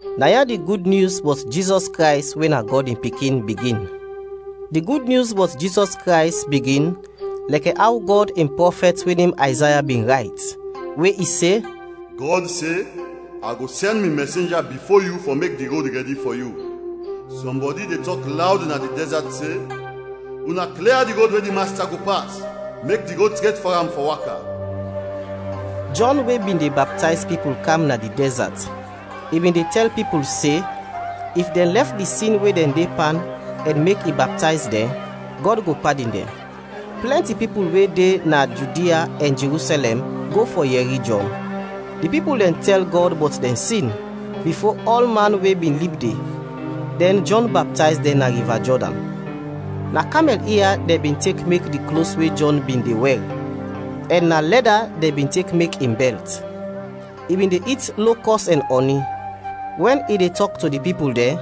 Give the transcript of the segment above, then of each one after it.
Na ya di Gud Nyus bɔt Jizɔs Krays we na Gɔd in Pikin, bigin. Di Gud Nyus bɔt Jizɔs Krays bigin lɛkɛ aw Gɔd in prɔfɛt we nem Ayzaya bin rayt, we i se: “Gɔd se, ‘A go sɛn mi mɛsenja bifo yu fɔ mek di rod rɛdi fɔ yu!’ Sɔmbɔdi de tɔk lawd na di dɛzat se, ‘Una klia di rod we di Masta go pas; mek di rod tret fɔ am fɔ waka!’” Jɔn we bin de baptayz pipul kam na di dɛzat, i bin de tɛl pipul se, if dɛn lɛf di sin we dɛn de pan ɛn mek i baptayz dɛn, Gɔd go padin dɛn. Plɛnti pipul we de na Judia ɛn Jerusɛlɛm go fɔ yɛri Jɔn. Di pipul dɛn tɛl Gɔd bɔt dɛn sin, bifo ɔlman we bin lib de, dɛn Jɔn baptayz dɛn na Riva Jɔdan. Na kamɛl ia dɛn bin tek mek di klos we Jɔn bin de wɛr ɛn na lɛda dɛn bin tek mek in bɛlt. I bin de it lokɔs ɛn ɔni. Wɛn i de tɔk to di pipul dɛn,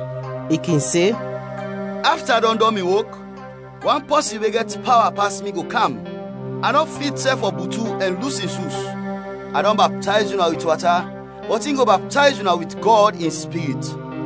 i kin se, “Afta a dɔn dɔn mi wok, wan pɔsin we gɛt pawa pas mi go kam. A nɔ fit sɛf fɔ butu ɛn lus in sus. A dɔn baptayz una wit wata, bɔt in go baptayz una wit Gɔd in Spirit.”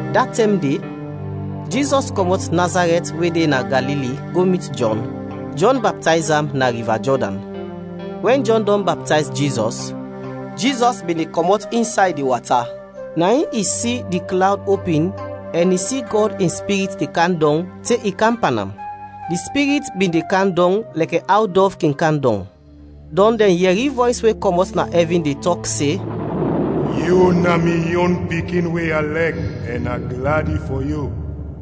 Da tɛm de, Jizɔs kɔmɔt Nazarɛt we de na Galili go mit Jɔn, Jɔn baptayz am na Riva Jɔdan. Wɛn Jɔn dɔn baptayz Jizɔs, Jizɔs bin de kɔmɔt insay di wata, na in i si di klawd opin ɛn i si Gɔd in Spirit de kam dɔng te i kam pan am. Di Spirit bin de kam dɔng lɛkɛ aw dɔv kin kam dɔng. Dɔn dɛn yɛri vɔys we kɔmɔt na ɛvin de tɔk se, “Yu na mi yon Pikin we a lɛk ɛn a gladi fɔ yu!”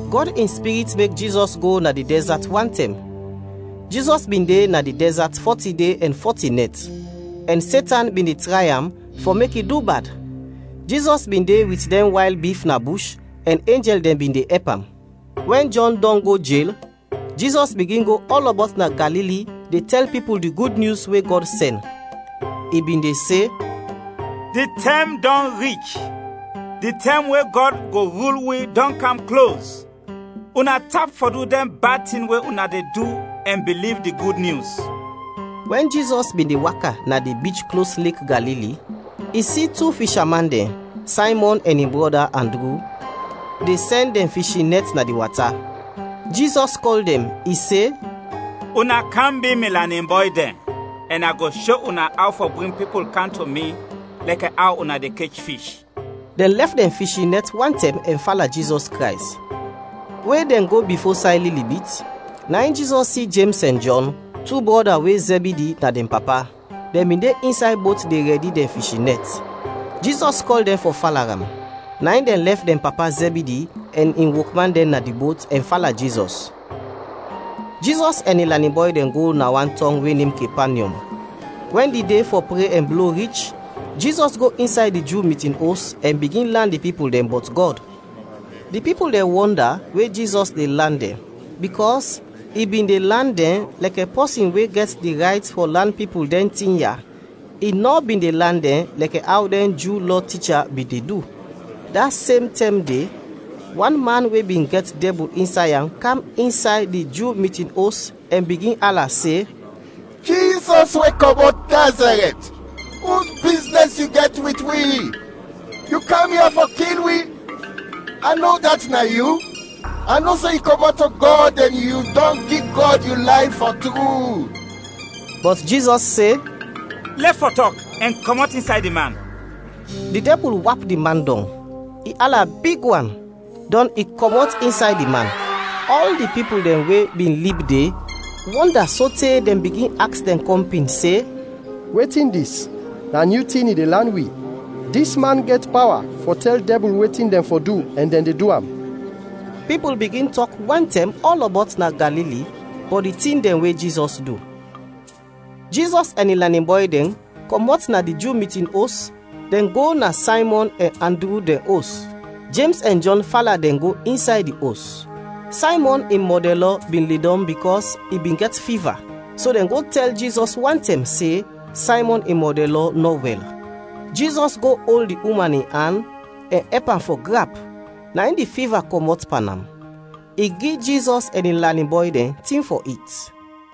Gɔd in Spirit mek Jizɔs go na di dɛzat wantɛm. Jizɔs bin de na di dɛzat fɔti de ɛn fɔti nɛt, ɛn Setan bin de tray am fɔ mek i du bad. Jizɔs bin de wit dɛn wayl bif na bush ɛn enjɛl dɛn bin de ɛp am. Wɛn Jɔn dɔn go jel, Jizɔs bigin go ɔlɔbɔt na Galili de tɛl pipul di Gud Nyus we Gɔd sɛn. I bin de se, “Di tɛm dɔn rich. Di tɛm we Gɔd go rul wi, dɔn kam klos. Una tap fɔ du dɛn bad tin we una de du ɛn biliv di Gud Nyus.” Wɛn Jizɔs bin de waka na di bich klos Lek Galili, i si tu fisha man dɛn, Saymɔn ɛn in brɔda Andru, de sɛn dɛn fishin nɛt na di wata. Jizɔs kɔl dɛn, i se, “Una kam bi mi lanin bɔy dɛn, ɛn a go sho una aw fɔ bring pipul kam to mi lɛkɛ aw una de kech fish.” Dɛn lɛf dɛn fishin nɛt wantɛm ɛn fala Jizɔs Krays. We dɛn go bifo say lili bit, na in Jizɔs si Jems ɛn Jɔn, tu brɔda we Zɛbidi na dɛn papa. Dɛn bin de insay bot de rɛdi dɛn fishin nɛt. Jizɔs kɔl dɛn fɔ fala am; na in dɛn lɛf dɛn papa Zɛbidi ɛn in wokman dɛn na di bot, ɛn fala Jizɔs. Jizɔs ɛn in lanin bɔy dɛn go na wan tɔng we nem Kepanyɔm. Wɛn di de fɔ pre ɛn blo rich, Jizɔs go insay di Ju mitin os, ɛn bigin lan di pipul dɛn bɔt Gɔd. Di pipul dɛn wɔnda we Jizɔs de lan dɛn, bikɔs i bin de lan dɛn lɛkɛ pɔsin we gɛt di rayt fɔ lan pipul dɛn tin ya, i nɔ bin de lan dɛn lɛkɛ aw dɛn Ju Lɔ ticha bin de du. Da sem tɛm de, wan man we bin gɛt dɛbul insay am kam insay di Ju mitin os ɛn bigin ala se, “Jizɔs we kɔmɔt Nazarɛt, us biznɛs yu gɛt wit wi? Yu kam ya fɔ kil wi? A no udat na yu, a no se yu kɔmɔt to Gɔd ɛn yu dɔn gi Gɔd yu layf fɔ tru.” Bɔt Jizɔs se, “Lɛf fɔ tɔk, ɛn kɔmɔt insay di man.” Di dɛbul wap di man dɔng, i ala big wan, dɔn i kɔmɔt insay di man. Ɔl di pipul dɛn we bin lib de wɔnda sote dɛn bigin aks dɛn kɔmpin se, “Wetin dis? Na nyu tin i de lan wi! Dis man gɛt pawa fɔ tɛl dɛbul wetin dɛn fɔ du ɛn dɛn de du am!” Pipul bigin tɔk wantɛm ɔlɔbɔt na Galili bɔt di tin dɛn we Jizɔs du. Jizɔs ɛn in lanin bɔy dɛn kɔmɔt na di Ju mitin os, dɛn go na Saymɔn ɛn Andru dɛn os. Jems ɛn Jɔn fala dɛn go insay di os. Saymɔn in mɔdɛnlɔ bin ledɔm bikɔs i bin gɛt fiva, so dɛn go tɛl Jizɔs wantɛm se Saymɔn in mɔdɛnlɔ nɔ wɛl. Jizɔs go ol di uman in an ɛn ɛp am fɔ grap, na in di fiva kɔmɔt pan am. I gi Jizɔs ɛn in lanin bɔy dɛn tin fɔ it.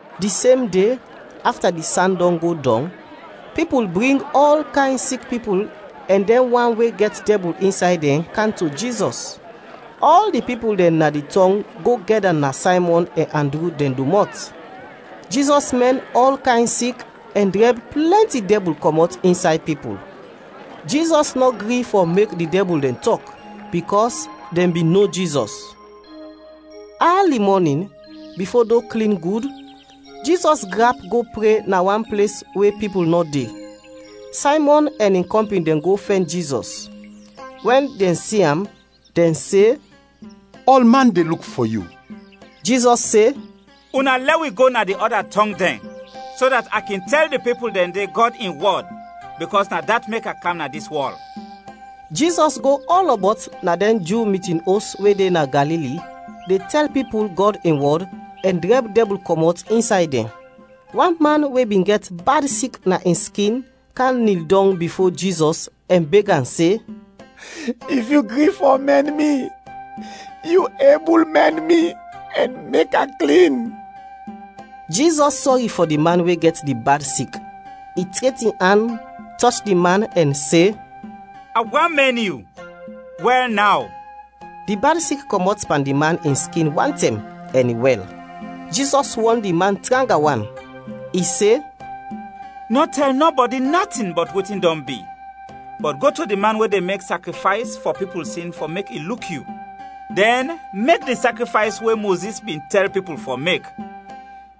Di sem de, afta di san go dɔng, pipul bring ɔl kayn sik pipul ɛn dɛn wan we gɛt dɛbul insay dɛn, kam to Jizɔs. Ɔl di pipul dɛn na di tɔng go gɛda na Saymɔn ɛn Andru dɛn domɔt. Jizɔs mɛn ɔl kayn sik ɛn drɛb plɛnti dɛbul kɔmɔt insay pipul. Jizɔs nɔ gri fɔ mek di dɛbul dɛn tɔk, bikɔs dɛn bin no Jizɔs. Ali mɔnin, bifo do klin gud, Jizɔs grap go pre na wan ples we pipul nɔ de. Saymɔn ɛn in kɔmpin dɛn go fɛn Jizɔs; wɛn dɛn si am, dɛn se, “Ɔlman de luk fɔ yu.” Jizɔs se, “Una lɛ wi go na di ɔda tɔng dɛn, so dat a kin tɛl di pipul dɛn de Gɔd in wɔd, bikɔs na dat mek a kam na dis wɔl.” Jizɔs go ɔlɔbɔt na dɛn Ju mitin os we de na Galili de tɛl pipul Gɔd in wɔd ɛn drɛb dɛbul kɔmɔt insay dɛn. Wan man we bin gɛt bad sik na in skin kam nil dɔng bifo Jizɔs ɛn beg am se, “If yu gri fɔ mɛn mi, yu ebul mɛn mi ɛn mek a klin.” Jizɔs sɔri fɔ di man we gɛt di bad sik, i tret in an, tɔch di man ɛn se, “A want mɛn yu, wɛl naw!” Di bad sik kɔmɔt pan di man in skin wantɛm, ɛn i wɛl. Jizɔs wɔn di man tranga wan, i se, “Nɔ tɛl nɔbɔdi natin bɔt wetin dɔn bi, bɔt go to di man we de mek sakrifays fɔ pipul sin fɔ mek i luk yu; dɛn mek di sakrifays we Mozis bin tɛl pipul fɔ mek.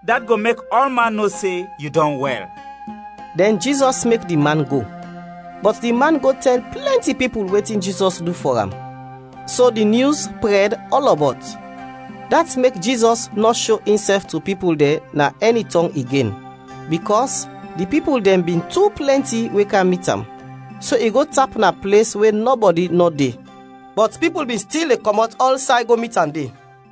Dat go mek ɔlman no se yu dɔn wɛl.” Dɛn Jizɔs mek di man go. Bɔt di man go tɛl plɛnti pipul wetin Jizɔs du fɔ am, so di nyus prɛd ɔlɔbɔt. Dat mek Jizɔs nɔ sho insɛf to pipul dɛn na ɛni tɔng igen, bikɔs di pipul dɛn bin tu plɛnti we kam mit am, so i go tap na ples we nɔbɔdi nɔ de. Bɔt pipul bin stil de kɔmɔt ɔlsay go mit am de.